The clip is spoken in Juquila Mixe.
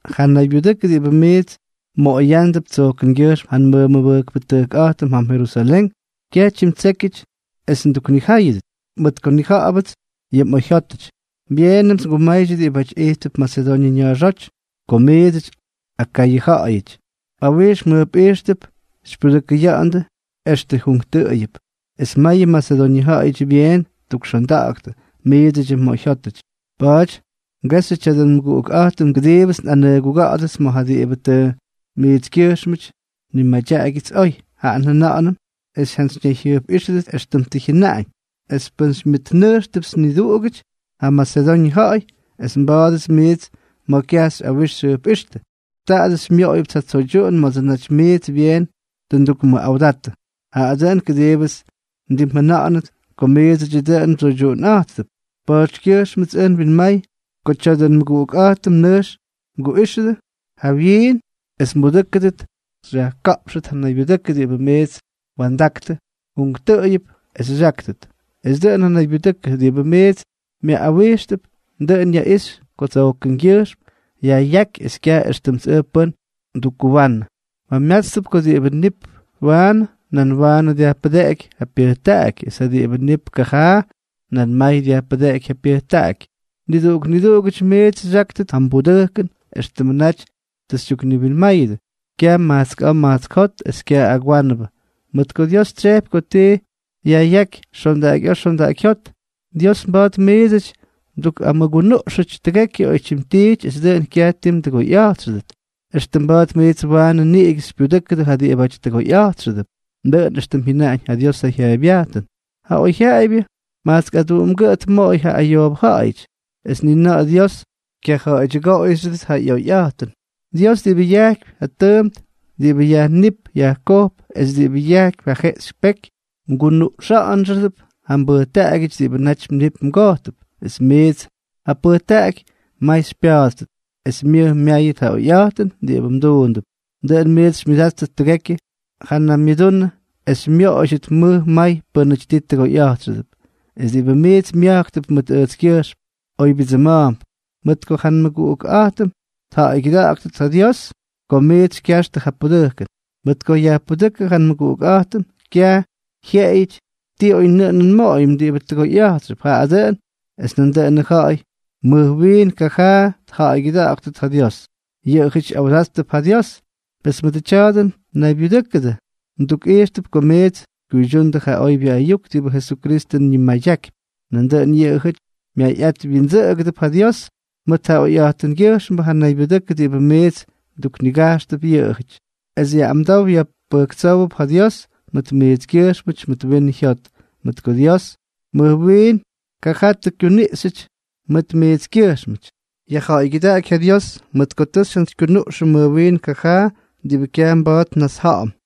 Ja naybyudʉkʉ diꞌibʉ miits mmoꞌoyándʉp tsojkʉngyʉjxm ja nmʉmʉbʉjkpʉꞌa̱jtʉm jam Jerusalén, kyaj tyimtsékyʉty es nduknijáyʉdʉt, mʉt ko nnija̱ꞌa̱bʉts yʉ mꞌoyjyótʉty. Byeenʉmts ngumaydyʉ diꞌibáty ijttʉp Masedoñʉ ña̱a̱xóty, ko miidsʉty, Akayʉ ja̱ꞌa̱yʉty, mꞌawijx mjʉjpꞌijxtʉp xypyudʉkʉya̱ꞌa̱ndʉ extʉ junktʉꞌʉyʉp, es mayʉ Masedoñʉ ja̱ꞌa̱yʉty byeen ttukxonda̱ꞌa̱ktʉ miidsʉdyʉ mꞌoyjyótʉty. Pa̱a̱dyʉts ngexyʉ tya̱dʉ nmʉguꞌukꞌa̱jtʉm kʉdiibʉts nꞌanʉguga̱ꞌa̱dʉts mʉt ja diꞌibʉ tʉ miitskyʉjxmʉty nnimadyaꞌagyʉts oy. Jaꞌa njʉna̱ꞌa̱nʉm es mjantsyñayjyʉjpꞌíxʉdʉt éxtʉmts tʉ njʉna̱ꞌa̱ñ. Es pʉn xymyʉtnʉjxtʉpts niduꞌugʉty ja Masedoñʉ ja̱ꞌa̱y es nba̱a̱dʉdʉts miits ma̱ kyaj xyꞌawix xyjʉjpꞌíxtʉ, taadʉ xymyoꞌoyʉpts ja tsoydyuꞌun ma̱dsʉ naty miits byeen tʉ ndukmʉꞌawdatʉ; jaꞌa dʉꞌʉn kʉdiibʉts ndimjʉna̱ꞌa̱nʉt ko miidsʉdyʉ dʉꞌʉn mdsoydyuꞌunꞌa̱jttʉp. Pa̱a̱tykyʉjxmʉts ʉj nwinma̱a̱y ko tya̱dʉ nmʉguꞌukꞌa̱jtʉm nʉjx mguꞌíxʉdʉ jawyiin es mbudʉ́kʉdʉt xyajka̱ꞌpxtʉt ja naybyudʉkʉ diꞌibʉ miits mwa̱ndaktʉ junktʉꞌʉyʉp es xyáktʉt; es dʉꞌʉn ja naybyudʉkʉ diꞌibʉ miits myaꞌꞌawijxtʉp, dʉꞌʉn yaꞌixy ko tsojkʉngyʉjxm yajꞌyáky es kyaj éxtʉmts ʉj pʉ́n ndukkuwanʉ. Mjamyátstʉp ko diꞌibʉ nip waanʉ, nan waanʉ dyajpʉdeꞌeky ja pyʉjtaꞌaky; es ja diꞌibʉ nip kajaa, nan may dyajpʉdeꞌeky ja pyʉjtaꞌaky. Niduꞌuk niduꞌugʉty miits xyáktʉt ja mbudʉjkʉn éxtʉmʉ naty tʉ xytyukniwinmáyʉdʉ, kyaj majtsk a̱a̱ majtsk jot es kyaj agwánʉbʉ, mʉt ko Dios tsyejpy ko ti yajꞌyáky xondaꞌakyꞌa̱a̱ xondaꞌakyjyót. Dios mba̱a̱t miidsʉty mdukꞌamʉgunuꞌxʉty tʉgekyʉ oytyim tiity es dʉꞌʉn kyaj ti mdʉgoyꞌa̱jtxʉdʉt, extʉ mba̱a̱t miits waanʉ niꞌigʉ xypyudʉ́kʉdʉ ja diꞌibáty tʉgoyꞌa̱jtxʉdʉp. Dʉꞌʉn éxtʉm jyʉnaꞌañ ja Diosʉ jyaaybyajtʉn: Ja oyjyaꞌaybyʉ majtsk aduꞌumgʉꞌʉ tmoꞌoy ja ayoobʉ ja̱ꞌa̱yʉty; es ni na̱ꞌa̱ Dios kyaja̱ꞌa̱ydyʉgoꞌoyxyʉdʉt ja ꞌyoyjyaꞌayꞌa̱jtʉn. Dios, diꞌibʉ yajkypy ja tʉʉmt diꞌibʉ yajníp yajkojp es diꞌibʉ yajkypy ja jeꞌxy peky, mgunuꞌxa̱ꞌa̱nxʉdʉp ja mbʉjtaꞌagyʉty diꞌibʉ naty mnip mgojtʉp, es miits ja pʉjtaꞌaky may xypya̱a̱ttʉt, es myʉj myáyʉt ja oyꞌa̱jtʉn diꞌibʉ mduundʉp. Dʉꞌʉn miits xymyʉdáttʉt tʉgekyʉ ja namyʉdunʉ es xymyoꞌoydyʉt mʉj may pʉ́nʉty tii tʉgoyꞌa̱jtxʉdʉp. Es diꞌibʉ miits mya̱jktʉp mʉt ʉjtskyʉjxm oybyʉdsʉma̱a̱mp, mʉt ko ja nmʉguꞌuktʉjkꞌa̱jtʉm tja̱ꞌa̱ygyʉda̱ꞌa̱ktʉt ja Dios ko miits xykyaxtʉ ja pudʉjkʉn. Mʉt ko yajpudʉ́kʉ ja nmʉguꞌukꞌa̱jtʉm, kyaj jyeꞌeyʉty ti oynʉꞌʉnʉn nmoꞌoyʉm diꞌibʉ tʉgoyꞌa̱jtxʉp, jaꞌa dʉꞌʉn es nandʉꞌʉnʉ ja̱ꞌa̱y mʉj wiin kajaabʉ tja̱ꞌa̱ygyʉda̱ꞌa̱ktʉt ja Dios. Yʉꞌʉjʉty ꞌyawdáttʉp ja Dios, pes mʉdʉ tya̱dʉ naybyudʉkʉ mdukꞌijxtʉp ko miits xykyuydyundʉ ja oybyʉ ayuk diꞌibʉ Jesukristʉ ñimadyakypy, nandʉꞌʉn yʉꞌʉjʉty myayꞌat wyindsʉꞌʉgʉdʉp ja Dios mʉt ja oyjyotkyʉjxmbʉ ja naybyudʉkʉ diꞌibʉ miits mduknigajxtʉp yʉꞌʉjʉty, es ꞌyamdow pyʉjtsówdʉp ja Dios mʉt miitskyʉjxmʉty mʉt winʉ jyot, mʉt ko Dios mʉj wiin kajaa tʉ kyuniꞌxyʉty mʉt miitskyʉjxmʉty. Yajja̱ꞌa̱ygyʉdaꞌaky ja Dios mʉt ko tʉ xyjantsykyunuꞌxʉm mʉj wiin kajaa, diꞌibʉ kyaj mba̱a̱t nnasja̱ꞌa̱m.